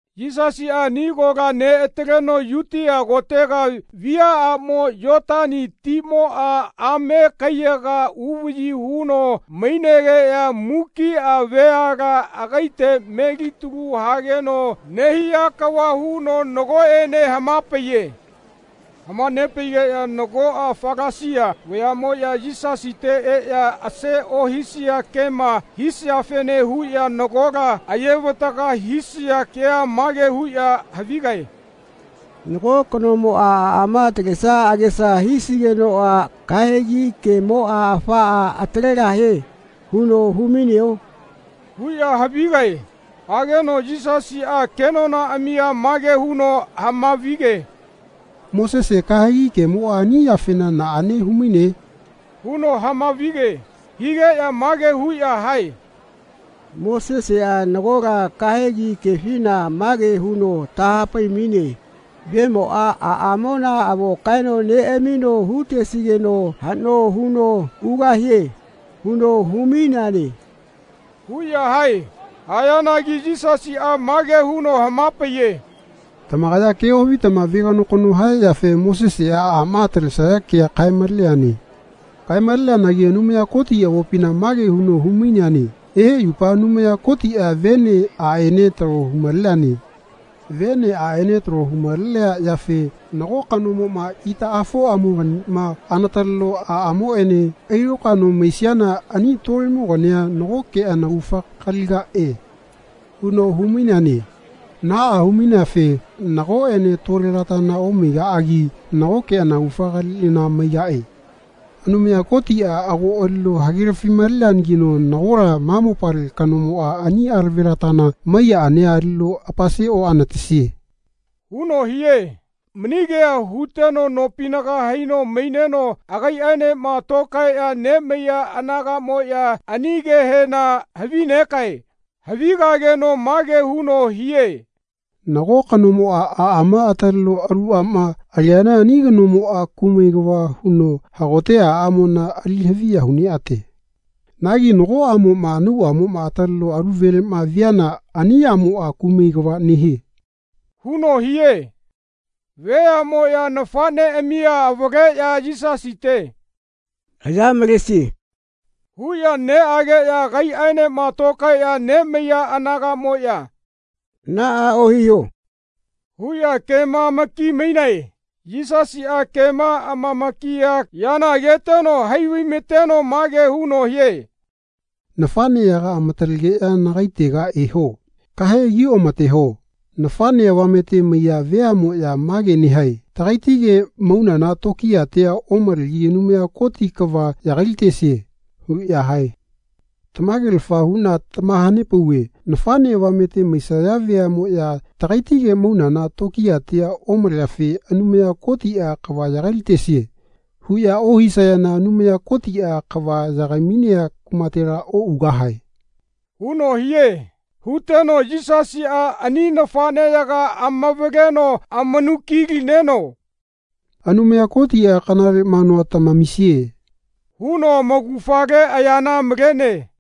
Yisasiꞌa ani kola neꞌataleno Yutia kotega viaꞌamo Yotani timoꞌa ame kaiyaga uvaꞌyi huno mainegeꞌya mukiꞌa veala agaite melitalu hageno nehia kava huno nagoꞌene hamapaiye. Hamanepaigeꞌya nagoꞌa Falasia vayaꞌmoꞌya Yisasite eꞌya ase ohisea kema hisiafene huꞌya nagola ayevataga hisaya kea mage huꞌya havigae “Nago kanomoꞌa aꞌama atalesia agesa hisigenoꞌa kahegi kemoꞌa ‘Afaꞌa atalegahie.’ huno humaineo?” huꞌya havigae. Hageno Yisasiꞌa kenonaꞌamia mage huno hamavige “Mosese kahegi kemoꞌa ani yafena naꞌane humaine?” huno hamavige. Higeꞌya mage huꞌya hae “Moseseꞌa nagola kahegi kefina mage huno tahapaimaine ‘Vemoꞌa aꞌamona avo kaeno neꞌamino hutesigeno haꞌno huno ugahie.’ huno humaineane.” huꞌya hae. Hayanagi Yisasiꞌa mage huno hamapaiye “Tamakaya ke ohavitama veganokano haya yafe Moseseꞌa aꞌma atalesaya kea kaemaleneane. Kaemaleneanagi Anumaya Koti avopina mage huno humaineane ‘Ehe yupa Anumaya Kotiꞌa vene aꞌene talo humaleneane. Vene aꞌene talo humalenea yafe nago kanomoꞌma itaꞌafoꞌamoganima anataleno aꞌamoꞌene ailokaeno maisiana ani tolemogania nagoke anaugafa kaligaꞌe.’ huno humaineane. Naꞌa humaineafe nagoꞌene tolelatana omaigaꞌagi nagoke anaugafa kaliꞌana maigaꞌe. Anumaya Kotiꞌa ago alino hagelafimaleneanagino nagola ma mopale kanomoꞌa ani alavelatana mai yaꞌania alino apase oꞌanatesie.” huno hie. Mani kea huteno nopinaga haino maineno agaiꞌaenema tokaeꞌya nemaiya anagaꞌmoꞌya ani kehena havinegae. Havigageno mage huno hie “Nago kanomoꞌa aꞌama ataleno alu aꞌma aliana ani kanomoꞌa kumai kava huno hagote aꞌamona ali haviya huneꞌate. Nagi nago aꞌmoꞌma anauꞌamoma ataleno alu veleꞌma viana ani aꞌmoꞌa kumai kava nehie.” huno hie. Veaꞌmoꞌya nafaꞌneꞌamia avaleꞌya Yisasite “Aya malese.” huꞌya neꞌageꞌya agaiꞌaenema tokaeꞌya nemaiya anagaꞌmoꞌya “Naꞌa ohiho.” huꞌya kemamakimainae. Yisasiꞌa kema amamakiya yana ageteno haivaimateno mage huno hie “Nafaꞌneyaga amatalegeꞌya nagaitega eho. Ka heakioꞌamateho. Nafaꞌne avamete maiya veaꞌmoꞌya mage nehae ‘Tagaitige maunana tokiyatia omalegi Anumaya Koti kava yagailatesie.” huꞌya hae. Tamagelafa huꞌna tamahanepauve nafaꞌne avamete maisaya veaꞌmoꞌya ‘Tagaitige maunana tokiyatia omaleafe Anumaya Kotiꞌa kava yagailatesie.’ huꞌya ohisayana Anumaya Kotiꞌa kava yagaimainea kumatela oꞌugahae.” huno hie. Huteno Yisasiꞌa ani nafaꞌneyaga amavaleno amanukilineno “Anumaya Kotiꞌa kanale manua tamamisie.” huno amaugafale ayana malene.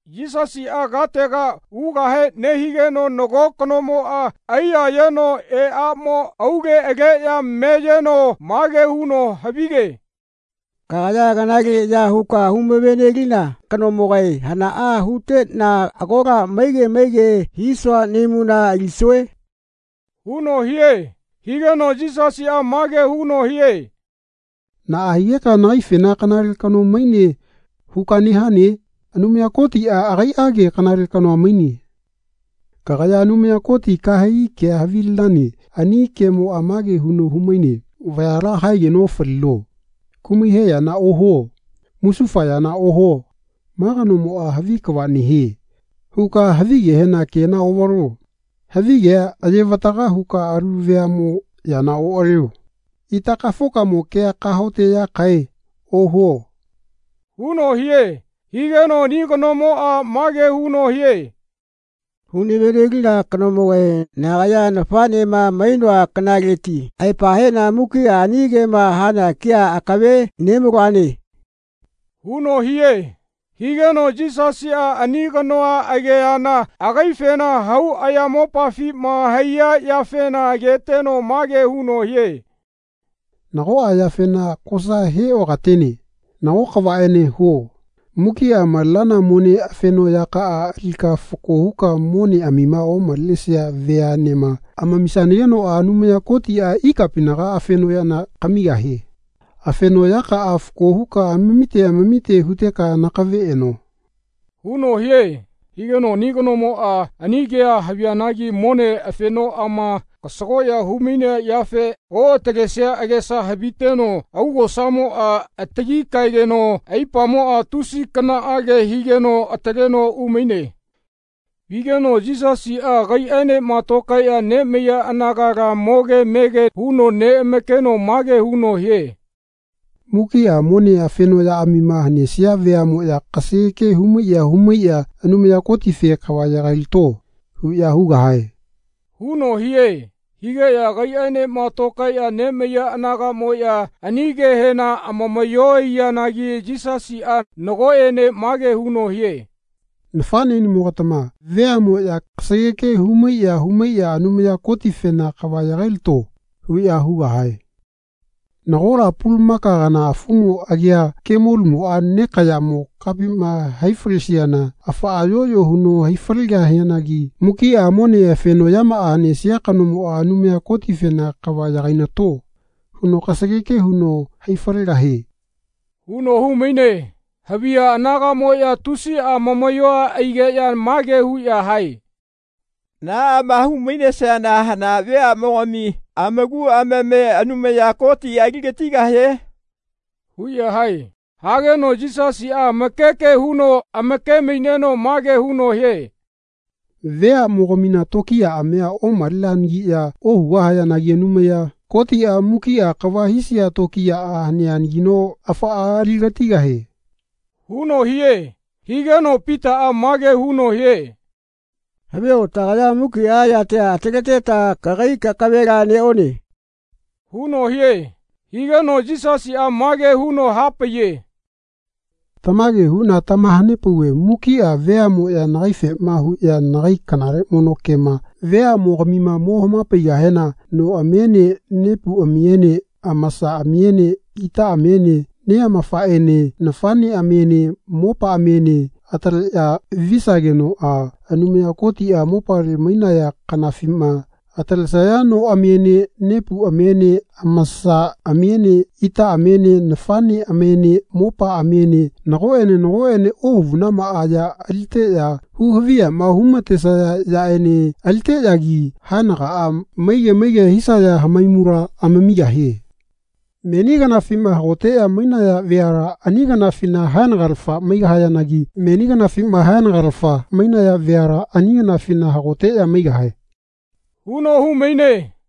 Yisasiꞌa katega ugahe nehigeno nago kanomoꞌa aiyayeno eaꞌamo aule aleꞌya meyeno mage huno havige “Kagaya kanale ya huka humavenelina kanomogae hanaꞌa huteꞌna agola maige maige hisua nahaimula alisue?” huno hie. Higeno Yisasiꞌa mage huno hie “Naꞌa higeka nagaifena ‘Kanale kano mainane.’ huka nehane? Anumaya Kotiꞌa agaiꞌage kanale kanoa maine. Kagaya Anumaya Koti kahegi kea havilinane ani kemoꞌa mage huno humaine ‘Vayala haegeno ofalino. Kumai he yana ohuo. Musufa yana ohuo. ‘Ma kanomoꞌa havi kava nehie.’ huka havigehena kena oꞌvalo. Havigea ayevataga huka alu veaꞌmo yana oꞌalio. Itakafokamo kea ‘Kahaoteꞌyakaꞌae.’ ohuo.” huno hie. Higeno ani kanomoꞌa mage huno hie “Hulavenelina kanomogae nagaya nafaꞌnema mainoa kanaleti aepa heꞌna mukiꞌa ani kema hana kea akave nemaloane.” huno hie. Higeno Yisasiꞌa ani kanoa ageana agaifena hau ayamopafima haiya yafena ageteno mage huno hie “Nagoꞌa yafena kosa heꞌokatene. Nago kavaꞌene huo. Mukiꞌa malenana mone afenoꞌyakaꞌa alika fako huka moneꞌamima omalenesia veaꞌnema amamisanagenoꞌa Anumaya Kotiꞌa ikapinaga afenoꞌyana kamigahie. Afenoꞌyakaꞌa fako huka amamite amamite huteka nakave eno.” huno hie. Higeno ani kanomoꞌa ani kea havianagi mone afenomaꞌama kasago humainea yafe oꞌatalesia agesa haviteno augosamoꞌa atili kaegeno aipamoꞌa tusi kanaꞌage higeno ataleno umaine. Vigeno Yisasiꞌa agaiꞌaenema tokaeꞌya nemaiya anagala moge mege huno neꞌamakeno mage huno hie “Mukiꞌa mone afenoꞌyaꞌamima hanesia veaꞌmoꞌya kasageke humaiꞌya humaiꞌya Anumaya Kotife ‘Kava yagailato.’ huꞌya hugahae.” huno hie. Higeꞌya agaiꞌaenema tokaeꞌya nemaiya anagaꞌmoꞌya ani kehena amamaꞌyoa aiyanagi Yisasiꞌa nagoꞌene mage huno hie “Nafaꞌneꞌnimogatama veaꞌmoꞌya kasageke humaiꞌya humaiꞌya Anumaya Kotifena ‘Kava yagailato.’ huꞌya hugahae. Nagola pulumaka kana afumo agia kemolumoꞌa nekaꞌyamo kapima haifalesiana afaꞌa yoꞌyo huno haifalegahianagi mukiꞌa mone afenoꞌyamaꞌa hanesia kanomoꞌa Anumaya Kotifena ‘Kava yagainato.’ huno kasageke huno haifalegahie.” huno humaine. Haviya anagaꞌmoꞌya tusiꞌa amamaꞌyo aigeꞌya mage huꞌya hae “Naꞌama humainesiana hana veaꞌmogami amaku amame Anumaya Kotiꞌa aligatigahie?” huꞌya hae. Hageno Yisasiꞌa amakeke huno amakemaineno mage huno hie “Veaꞌmogamina tokiyaꞌamia omaleneanagiꞌya ohugahayanagi Anumaya Kotiꞌa mukiꞌa kava hisia tokiyaꞌa haneanagino afaꞌa aligatigahie.” huno hie. Higeno Pitaꞌa mage huno hie “Havio tagaya mukiꞌa yatia ataleteta kagai kakavela neꞌone.” huno hie. Higeno Yisasiꞌa mage huno hapaiye “Tamage huꞌna tamahanepauve mukiꞌa veaꞌmoꞌya nagaifema huꞌya nagai kanale mono kema veaꞌmogamima mo hamapaigahena noꞌamiene nepuꞌamiene amasaꞌamiene itaꞌamiene neꞌamafaꞌene nafaꞌneꞌ-amiene mopaꞌamiene amataleꞌya visagenoꞌa Anumaya Kotiꞌa mopale mainaya kanafima atalenesaya noꞌamiene nepuꞌamiene amasaꞌamiene itaꞌamiene nafaꞌneꞌamiene mopaꞌamiene nagoꞌene nagoꞌene ohavunamaꞌa ya aliteꞌya huhaviyama humatesaya yaꞌene aliteꞌyagi haenagaꞌa maige maige hisaya hamaimula amamigahie. Meni kanafima hagoteꞌya mainaya veala ani kanafina haenagalafa maigahayanagi meni kanafima haenagalafa mainaya veala ani kanafina hagoteꞌya maigahae.” huno humaine.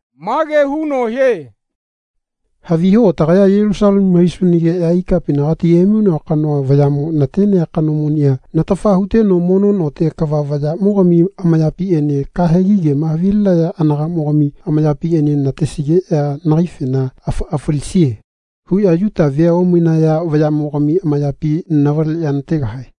Mage huno hie “Haviho tagaya Yelusalemu haisunageꞌya ikapinagati emainoa kanoa vayaꞌmo natenea kanomonia natafa huteno mono note kava vayaꞌmogami amayapiꞌene kahegi kema havilinaya anagaꞌmogami amayapiꞌene natesigeꞌya nagaifena ‘Afaꞌa falisie.’ huꞌya Yuta vea omainaya vayaꞌmogami amayapi navaleꞌya nategahae.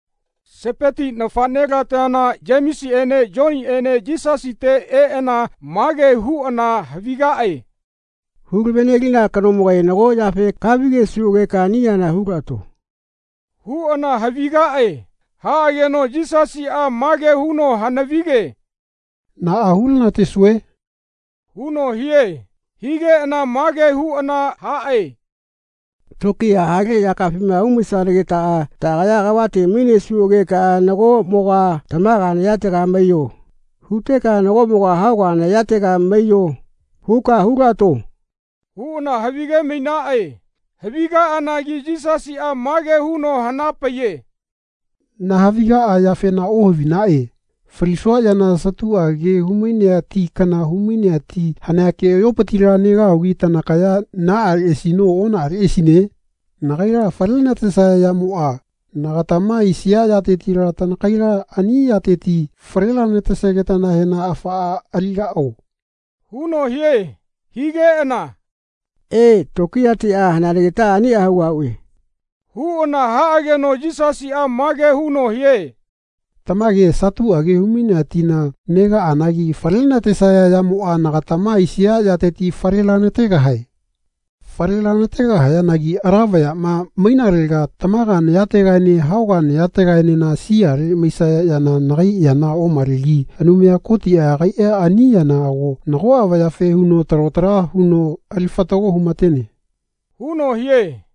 Sepeti nafaꞌnelatana Yemesiꞌene Yoniꞌene Yisasite eꞌana mage huꞌana havigaꞌe “Hulavenelina kanomogae nago yafe kahavigesuꞌageka ani yana hulaꞌato.” huꞌana havigaꞌe. Haꞌageno Yisasiꞌa mage huno hanavige “Naꞌa hulanatesue?” huno hie. Higeꞌana mage huꞌana haꞌe “Tokiya hale yakaꞌafima umaisanagetaꞌa taꞌagaya kavate mainesuꞌageka ‘Nagoꞌmoga tamaga nayatega maiyo.’ huteka ‘Nagoꞌmoga hauga nayatega maiyo.’ huka hulaꞌato.” huꞌana havigemainaꞌe. Havigaꞌanagi Yisasiꞌa mage huno hanapaiye “Nahavigaꞌa yafena ohavinaꞌe. Falisua yana satuꞌage humainea ti kana humainea ti hanea keꞌayopitila negahugi tanakaya naꞌaleꞌasino onaꞌaleꞌasine? Nagaila falenatesaya yamoꞌa, nagatama aisia yatetila tanakaila ani yateti falelanatesagetanahena afaꞌa aligaꞌo?” huno hie. Higeꞌana “E, tokiyatiꞌa haneanagitaꞌa aniꞌa hugahuꞌe.” huꞌana haꞌageno Yisasiꞌa mage huno hie “Tamage satuꞌage humainea tina negaꞌanagi falenatesaya yamoꞌa nagatama aisia yateti falelanategahae. Falelanategahayanagi ala vayaꞌma mainalega tamaga nayategaene hauga nayategaenena siale maisaya yana nagai yana omalegi Anumaya Kotiꞌa agaiꞌa ani yana ago nagoꞌa vayafe huno talo tala huno ali fatago humatene.” huno hie.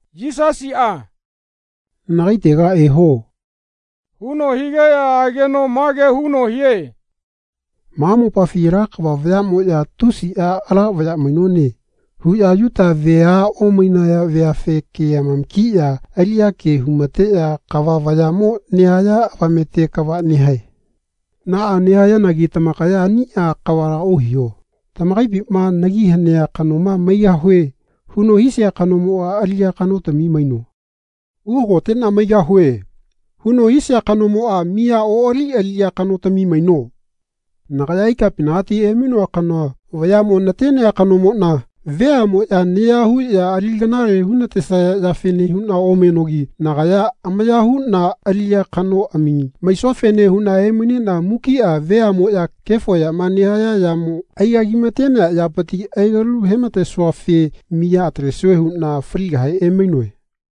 Yisasiꞌa “Nagaitega eho.” huno higeꞌya ageno mage huno hie “Ma mopafi ala kava vayaꞌmoꞌya ‘Tusiꞌa ala vaya mainone.’ huꞌya Yuta vea omainaya veafe ke amamakiꞌya aliꞌya ke humateꞌya kava vayaꞌmo nehaya avamete kava nehae. Naꞌa nehayanagi tamakaya aniꞌa kavala ohiho. Tamakaipima ‘Nagi hanea kanoma maigahue.’ huno hisia kanomoꞌa aliꞌya kanotami maino. ‘Uhagoteꞌna maigahue.’ huno hisia kanomoꞌa miya oꞌali aliꞌya kanotami maino. Nagaya ikapinagati emainoa kanoa vayaꞌmo natenea kanomoꞌna veaꞌmoꞌya naya huꞌya ali kanale hunatesaya yafene huꞌna omenogi nagaya amaya huꞌna aliꞌya kanoꞌami maisuafene huꞌna emaineꞌna mukiꞌa veaꞌmoꞌya kefo yama nehaya yamo aigagimatenea yapiti alikalu hematesuafe miya atalesue huꞌna faligahe emainoe.”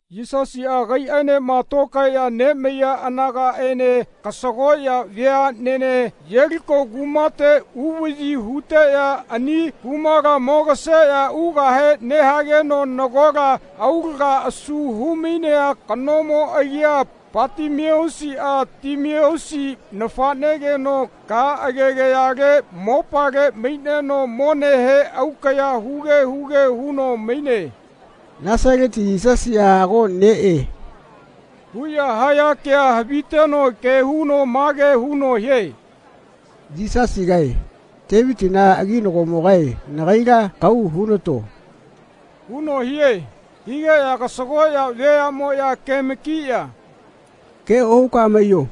Yisasiꞌa agaiꞌaenema tokaeꞌya nemaiya anagaꞌene kasagoꞌya veaꞌnene Yeliko kumate uvaꞌyi huteꞌya ani kumala mogaseꞌya ugahe nehageno nagola aulaga asu humainea kanomo agia Patimeusiꞌa Timeusi nafaꞌnegino ka agegayale mopale maineno monehe aukaꞌya huge huge huno maine. “Nasaleti Yisasiꞌa ago neꞌe” huꞌya haya kea haviteno ke huno mage huno hie “Yisasigae, Tevitina aginagomogae nagaila kahau hunato.” huno hie. Higeꞌya kasagoꞌya veaꞌmoꞌya kemakiꞌya “Ke ohuka maiyo.”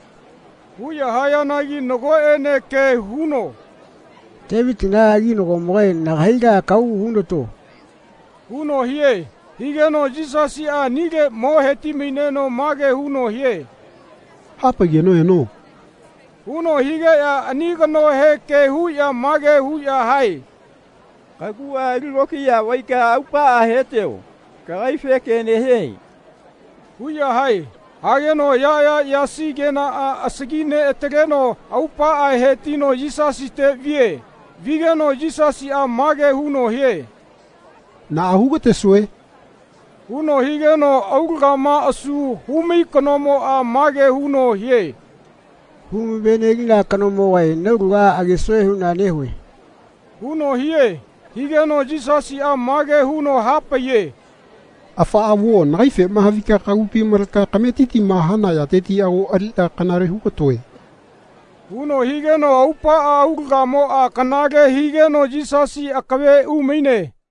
huꞌya hayanagi nagoꞌene ke huno “Tevitina aginagomogae nagaila kahau hunato.” huno hie. Higeno Yisasiꞌa anile mo hetimaineno mage huno hie “Hapaigeno eno.” huno higeꞌya ani kanohe ke huꞌya mage huꞌya hae “Kaguꞌa ali lokiya vaika aupaꞌa hetio. Kagaife ke nehie.” huꞌya hae. Hageno ayaꞌaya yasi kenaꞌa asagi neꞌataleteno aupaꞌa hetino Yisasite vie. Vigeno Yisasiꞌa mage huno hie “Naꞌa hugatesue?” huno higeno aulagama asu humai kanomoꞌa mage huno hie “Humavenelina kanomogae naulaga agesue huꞌna nehue.” huno hie. Higeno Yisasiꞌa mage huno hapaiye “Afaꞌa vuo nagaifema havika kagupi maleka kametitima hana yateti ago aliꞌna kanale hugatoe.” huno higeno aupaꞌa aulagamoꞌa kanale higeno Yisasi akave umaine.